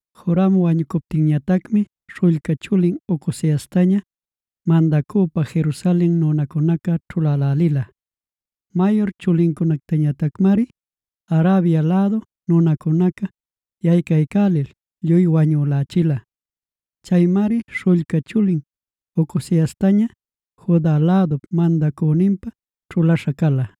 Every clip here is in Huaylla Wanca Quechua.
Joram wañucuptinmi śhullca chulin Ocoziastaña, mandacüpa Jerusalen nunacunaca ćhulälälila. Mayur chulincunactañatacmari Arabia lädu nunacunaca yaycaycälil lluy wañülächila. Chaymari śhullca chulin Ocoziastaña, Juda lädup mandacüninpä ćhulaśha cala.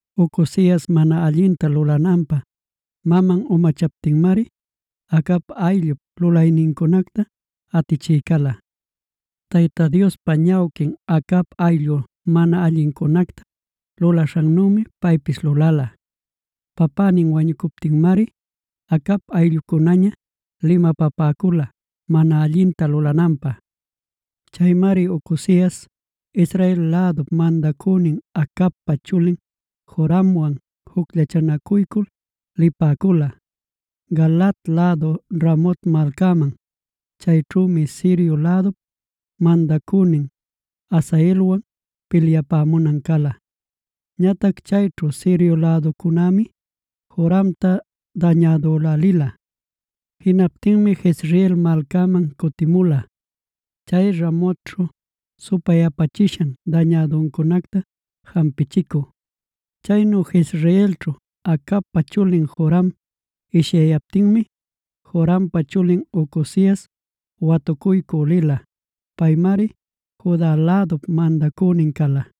Ocozias mana allinta lulananpä maman umachaptinmari, Acab ayllup lulaynincunacta atichï cala. Tayta Diospa ñawquin Acab ayllu mana allincunacta lulaśhannümi paypis lulala. Papänin wañucuptinmari Acab ayllucunäña limapapäcula mana allinta lulananpä. Chaymari Ocozias, Israel lädup mandacünin Acabpa chulin Joramwan jucllachanacuycul lipäcula, Galaad lädu Ramot malcaman. Chayćhümi Sirio lädup mandacünin Hazaelwan pilyapämunan cala. Ñatac chayćhu Sirio läducunämi Joramta dañädülälila. Jinaptinmi Jezreel malcaman cutimula, chay Ramotćhu supayapachishan dañäduncunacta jampichicü. Chaynu Jezreelćhu, Acabpa chulin Joram ishyayaptinmi, Jorampa chulin Ocozias watucuycü lila. Paymari Juda lädup mandacünin cala.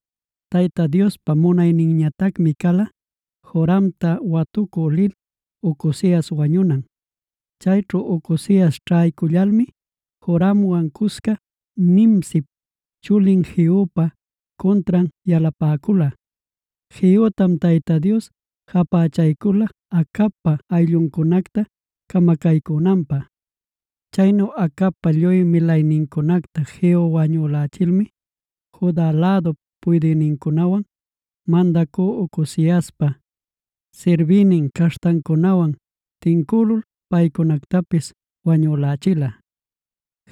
Tayta Diospa munayninñatacmi cala, Joramta watucü lil Ocozias wañunan. Chayćhu Ocozias ćhaycullalmi, Joramwan cusca Nimsip chulin Jehupa cuntran yalapäcula. Jehutam Tayta Dios japächaycula Acabpa aylluncunacta camacaycünanpä. Chaynu Acabpa lluy milaynincunacta Jehu wañuyächilmi, Juda lädup puydïnincunawan, mandacü Ocoziaspa sirbïnin caśhtancunawan tincülul, paycunactapis wañülächila.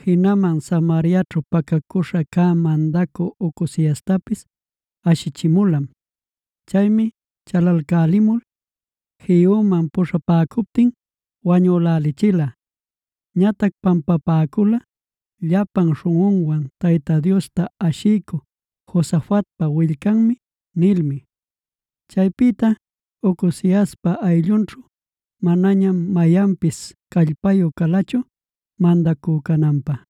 Jinaman Samariaćhu pacacüśha cä mandacü Ocoziastapis ashichimulam. Chaymi chalalcälimul Jehuman puśhapäcuptin wañülälichila. Ñatac pampapäcula: “Llapan śhunꞌunwan Tayta Diosta ashiycü Josafatpa willcanmi” nilmi. Chaypïta Ocoziaspa ayllunćhu manañam mayanpis callpayü calachu mandacü cananpä.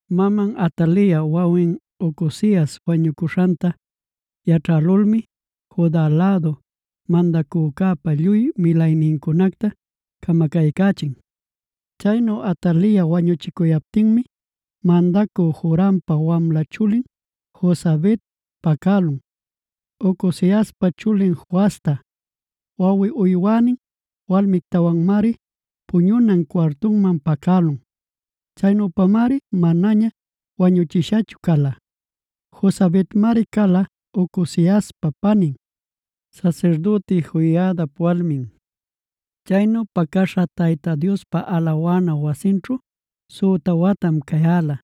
Maman Atalia wawin Ocozias wañucuśhanta yaćhälulmi, Juda lädu mandacücäpa lluy milaynincunacta camacaycächin. Chaynu Atalia wañuchicuyaptinmi, mandacü Jorampa wamla chulin Josabet pacälun, Ocoziaspa chulin Joasta. Wawi uywänin walmictawanmari puñunan cuartuman pacälun. Chaynüpamari manaña wañuchishachu cala. Josabetmari cala, Ocoziaspa panin, sasirdüti Joiadap walmin. Chaynu pacäśha Tayta Diospa alawana wasinćhu süta watam cayäla.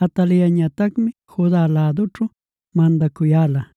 Ataliañatacmi Juda lädućhu mandacuyäla.